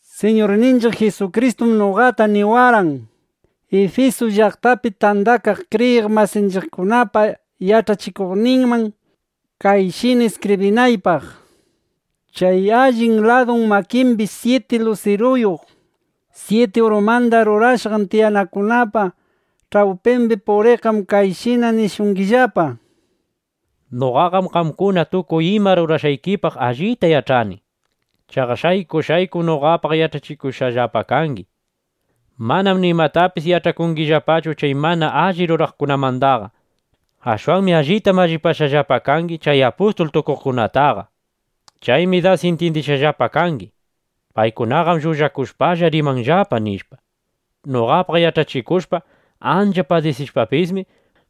Siñurninchiq Jisukristum noqa Jwanda niwarqan, Ifisu llaqtapi tandakaq kriyiq masinchiqkunapa yach'achikuqninman kayshina iskibrinaypaq: “Chay allin ladu makimbi syiti lusiruyuq syiti urumanda rurashqan tiyanakunapa ch'awpimbi puriqqam kayshina nishungillapa: Noqaqam qamkuna tukuy ima rurashqaykipaq allita yach'ani. Chaqa shayku shaykum noqapaq yach'achikushqallapa kangi. Manam nimatapis yach'akungillapachu chay mana alli ruraqkunamandaqa. Ashwanmi allita mallipashqallapa kangi chay apustul tukuqkunataqa. Chaymi das intyindishqallapa kangi: Paykunaqam llullakushpalla rimanllapa, nishpa. Noqapaq yach'achikushpa ancha padisishpapismi,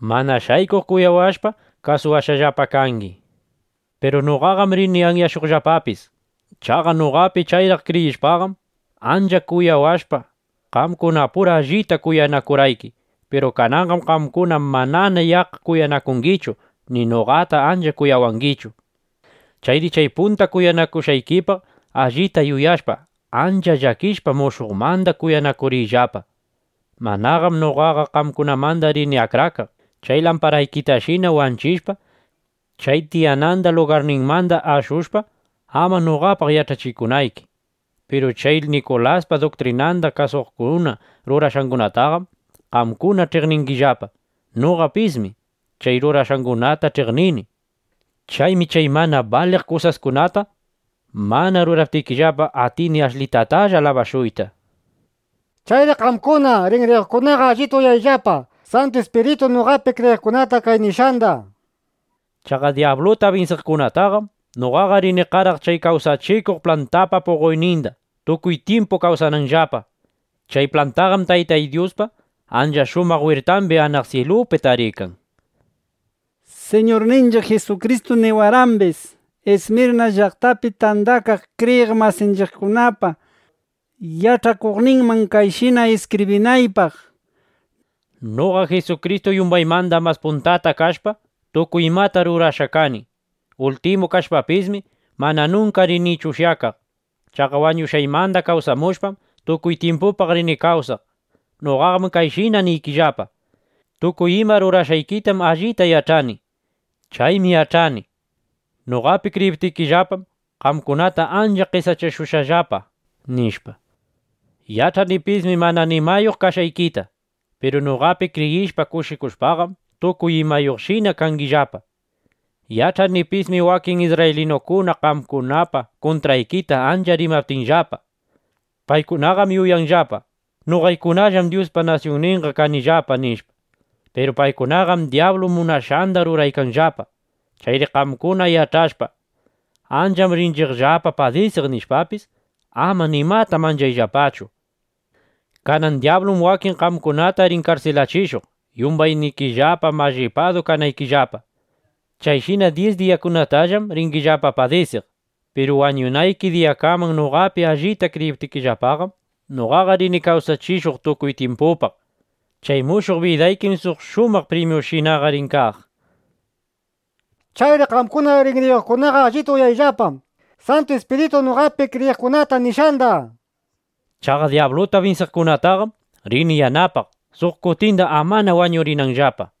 mana shaykuq kuyawashpa, kasuwashqallapa kangi. Piru noqaqam rini anyashuqllapapis. Chaqa noqapi chayraq kriyishpaqam, ancha kuyawashpa, qamkunapura allita kuyanakurqayki. Piru kananqam qamkuna manana yaqqa kuyanakungichu ni noqata ancha kuyawangichu. Chayri chay punta kuyanakushqaykipaq allita yuyashpa, ancha llakishpa, mushuqmanda kuyanakuriyllapa. Manaqam noqaqa qamkunamanda rini akrakaq, chay lamparaykitashina wanchishpa, chay tiyananda lugarninmanda ashushpa (amana noqapaq yach'achikunayki). Piru chay Nikulaspa duktrinanda kasukuqkuna rurashqangunatam qamkuna ch'iqningillapa. Noqapismi chay rurashqangunata ch'iqnini. Chaymi chay mana baliq kusaskunata mana ruraptikillapa, atini ashlitatalla alabashuyta. Chayri qamkuna rinriyuqkunaqa allita uyayllapa Santu Ispirituy noqapi kriyiqkunata kay nishqanda. Chaqa dyabluta binsiqkunataqam noqaqa rini qaraq chay kawsachikuq plantapa puqoyninda, tukuy tyimpu kawsananllapa. Chay plantaqam Taytay Dyuspa ancha shumaq wirtambi anaq syilupi tarikan”, nishpa. Siñurninchiq Jisukristum niwarqambis, Ismirna llaqtapi tandakaq kriyiq masinchiqkunapa yach'achikuqninman kayshina iskibrinaypaq: “Noqa Jisukristuqam yumbaymanda mas puntata kashpa, tukuy imata rurashqa kani. Ultimu kashpapismi, mana nunka rinichu ushyakaq. Chaqa wañushqaymanda kawsamushpam, tukuy tyimpupaq rini kawsaq. Noqaqam kayshina niykillapa: Tukuy ima rurashqaykitam allita yach'ani. Chaymi yach'ani: Noqapi kriyiptikillapam, qamkunata ancha qesachashushqallapa, nishpa. Yach'anipismi mana nimayuq kashqaykita. Piru noqapi kriyishpa, kushikushpaqam, tukuy imayuqshina kangillapa. Yach'anipismi wakin isrraylinukuna qamkunapa kuntraykita ancha rimaptinllapa. (Paykunaqam yuyanllapa: Noqaykunallam Dyuspa nasyunninqa kanillapa, nishpa.) Piru paykunaqam dyablu munashqanda ruraykanllapa. Chayri qamkuna yach'ashpa: Ancham rinchiqllapa padisiq, nishpapis, ama nimata manchayllapachu. Kanan dyablum wakin qamkunata rin karsilachishuq, yumbaynikillapa mallipadu kanaykillapa. Chayshina dyis diyaskunatallam ringillapa padisiq. Piru wañunayki diyakaman noqapi allita kriyiptikillapaqam, noqaqa rini kawsachishuq tukuy tyimpupaq. Chay mushuq bidaykim suq shumaq primyushinaqa rin kaq. Chayri qamkuna rinriyuqkunaqa allita uyayllapa Santu Ispirituy noqapi kriyiqkunata nishqanda. Chaqa dyabluta binsiqkunataqam rini yanapaq, suq kutinda amana wañurinanllapa”, nishpa.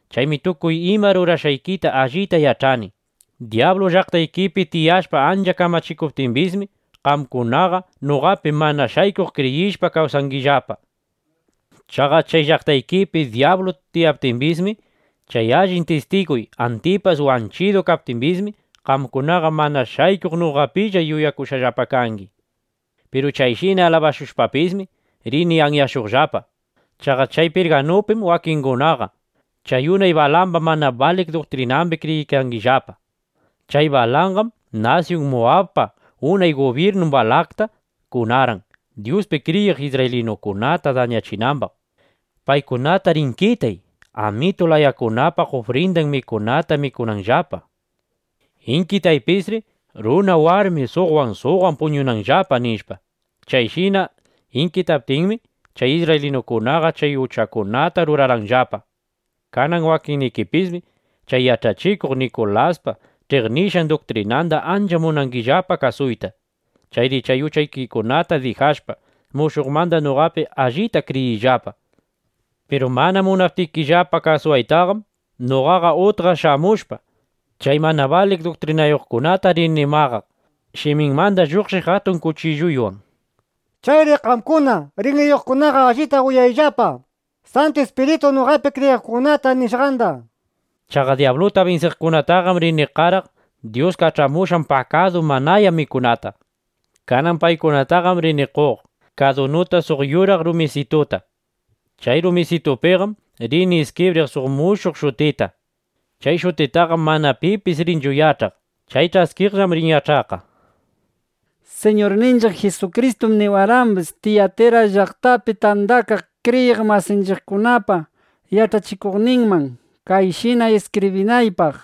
Chaymi tukuy ima rurashqaykita allita yach'ani: Dyablu llaqtaykipi tiyashpa ancha kamachikuptimbismi, qamkunaqa noqapi mana shaykuq kriyishpa kawsaykangillapa. Chaqa chay llaqtaykipi dyablu tiyaptimbis, chay allin tistiguy Antipas wanchidu kaptimbismi, qamkunaqa mana shaykuq noqapilla yuyakushqallapa kangi. Piru chayshina alabashushpapismi, rini anyashuqllapa. Chaqa chay Pirgamupim wakinnikikunaqa chay unay Balamba mana baliq duktrinambi kriyiykangillapa. Chay Balanqam nasyun Muwabpa unay gubyirnun Balakta kunarqan, Dyuspi kriyiq isrraylinukunata dañachinambaq: ‘Paykunatar inkitay, amitu layakunapa ufrindan mikunata mikunanllapa. Inkitaypisri runa, warmi suqwan suqwan puñunanllapa’, nishpa. (Chayshina inkitaptinmi, chay isrraylinukunaqa chay uchakunata rurarqanllapa.) Kanan wakinnikipismi chay yach'achikuq Nikulaspa ch'iqnishqay duktrinanda ancha munangillapa kasuyta. Chayri chay uchaykikunata dijashpa, mushuqmanda noqapi allipta kriyiriyllapa. Piru mana munaptikillapa kasuwaytaqam, noqaqa utqa shamushpa, chay mana baliq duktrinayuqkunata rini maqaq shimiymanda lluqshiq atun kuchilluywan. Chayri qamkuna rinriyuqkunaqa allita uyayllapa Santu Ispirituy noqapi kriyiqkunata nishqanda. Chaqa dyabluta binsiqkunataqam rini qaraq Dyus kach'amushqan pakadu manaya mikunata. Kanan paykunataqam rini qoq kadunuta suq yuraq rumisituta. Chay rumisitupiqam rini iskibriq suq mushuq shutita. Chay shutitaqam mana pipis rinchu yach'aq. Chay ch'askiqllam rin yach'aqqa”, nishpa. Siñurninchiq Jisukristum niwarqambis, Tiyatira llaqtapi tandakaq kriyiq masinchiqkunapa yach'achikuqninman kayshina iskibrinaypaq: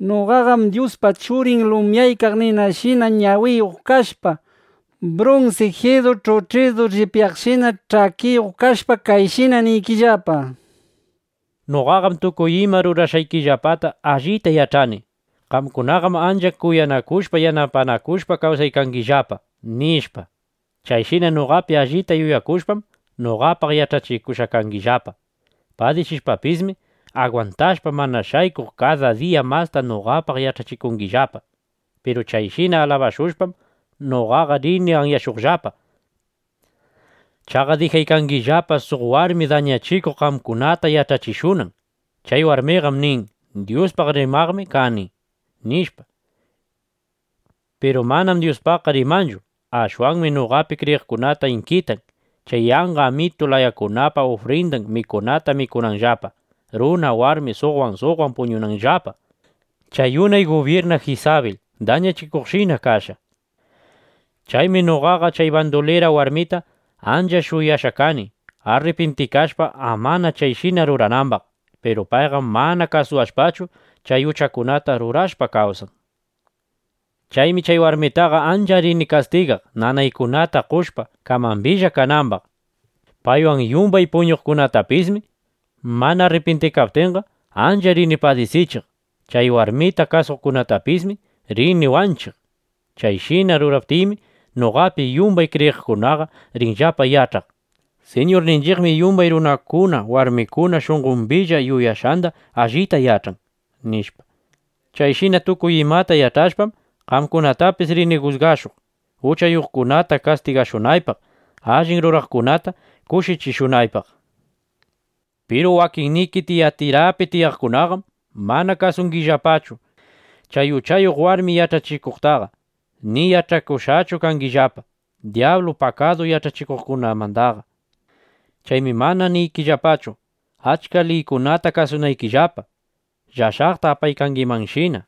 “Noqaqam Dyuspa Churin lumyaykaq ninashina ñawiyuq kashpa, brunsi jirru ch'uch'idu llipyaqshina ch'akiyuq kashpa, kayshina niykillapa: Noqaqam tukuy ima rurashqaykillapata allita yach'ani: Qamkunaqam ancha kuyanakushpa, yanapanakushpa kawsaykangillapa, nishpa. Chayshina noqapi allita yuyakushpam, noqapaq yach'achikushqa kangillapa. Padisishpapismi agwantashpa, mana shaykuq kada diya masta noqapaq yach'achikungillapa. Piru chayshina alabashushpam, noqaqa rini anyashuqllapa. Chaqa dijaykangillapa, suq warmi dañachikuq qamkunata yach'achishunan. Chay warmiqam nin: ‘Dyuspaq rimaqmi kani’, nishpa. Piru manam Dyuspaqqa rimanchu. Ashwanmi noqapi kriyiqkunata inkitan, chay yanqa amitu layakunapa ufrindan mikunata mikunanllapa, runa, warmi suqwan suqwan puñunanllapa. Chay unay gubyirna Jisabil dañachikuqshina kashqa. Chaymi noqaqa chay bandulira warmita ancha shuyashqa kani, arripintikashpa, amana chayshina ruranambaq. Piru payqam mana kasuwashpachu, chay uchakunata rurashpa kawsan. Chaymi chay warmitaqa ancha rini kastigaq, nanaykunata qoshpa, kamambilla kanambaq. Paywan yumbay puñuqkunatapismi mana arripintikaptinqa, ancha rini padisichiq. Chay warmita kasuqkunatapismi rini wanchiq. Chayshina ruraptiymi, noqapi yumbay kriyiqkunaqa rinllapa yach'aq: Siñurninchiqmi yumbay runakuna, warmikuna shunqombilla yuyashqanda allita yach'an, nishpa. Chayshina tukuy imata yach'ashpam, qamkunatapis rini jusgashuq, uchayuqkunata kastigashunaypaq, allin ruraqkunata kushichishunaypaq. ’Piru wakinniki Tiyatirapi tiyaqkunaqam mana kasungillapachu chay uchayuq warmi yach'achishuqtaqa ni yach'akushqachu kangillapa dyablu pakadu yach'achikushqandaqa. Chaymi mana niykillapachu, achka liykunata kasunaykillapa, llashaqta apaykangimanshina.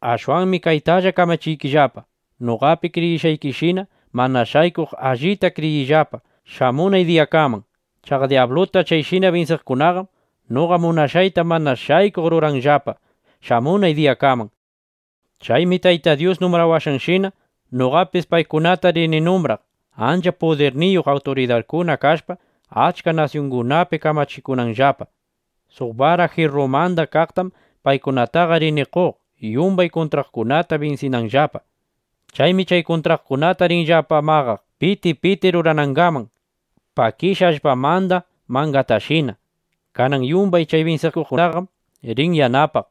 Ashwanmi kaytalla kamachiykillapa: Noqapi kriyishqaykishina, mana shaykuq allita kriyiyllapa shamunay diyakaman. Chaqa dyabluta chayshina binsiqkunaqam noqa munashqayta mana shaykuq ruranqallapa shamunay diyakaman. Chaymi Taytay Dyus numbrawashqanshina, noqapis paykunata rini numbraq, ancha pudirniyuq awturidarkuna kashpa, achka nasyungunapi kamachikunanllapa. Suq bara jirrumanda kaqtam paykunataqa rini qoq, yumbay kuntraqkunata binsinanllapa. Chaymi chay kuntraqkunata rinllapa maqaq, piti piti ruranangaman, pakishqa allpamanda mangatashina. Kanan yumbay chay binsikuqtaqam rini yanapaq,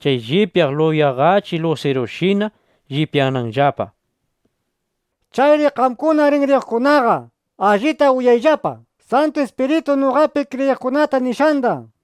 chay llipyaq yulaqachi (yuraqachi) lusirushina llipyananllapa. Chayri qamkuna rinriyuqkunaqa, allita uyayllapa Santu Ispirituy noqapi kriyiqkunata nishqanda”, nishpa.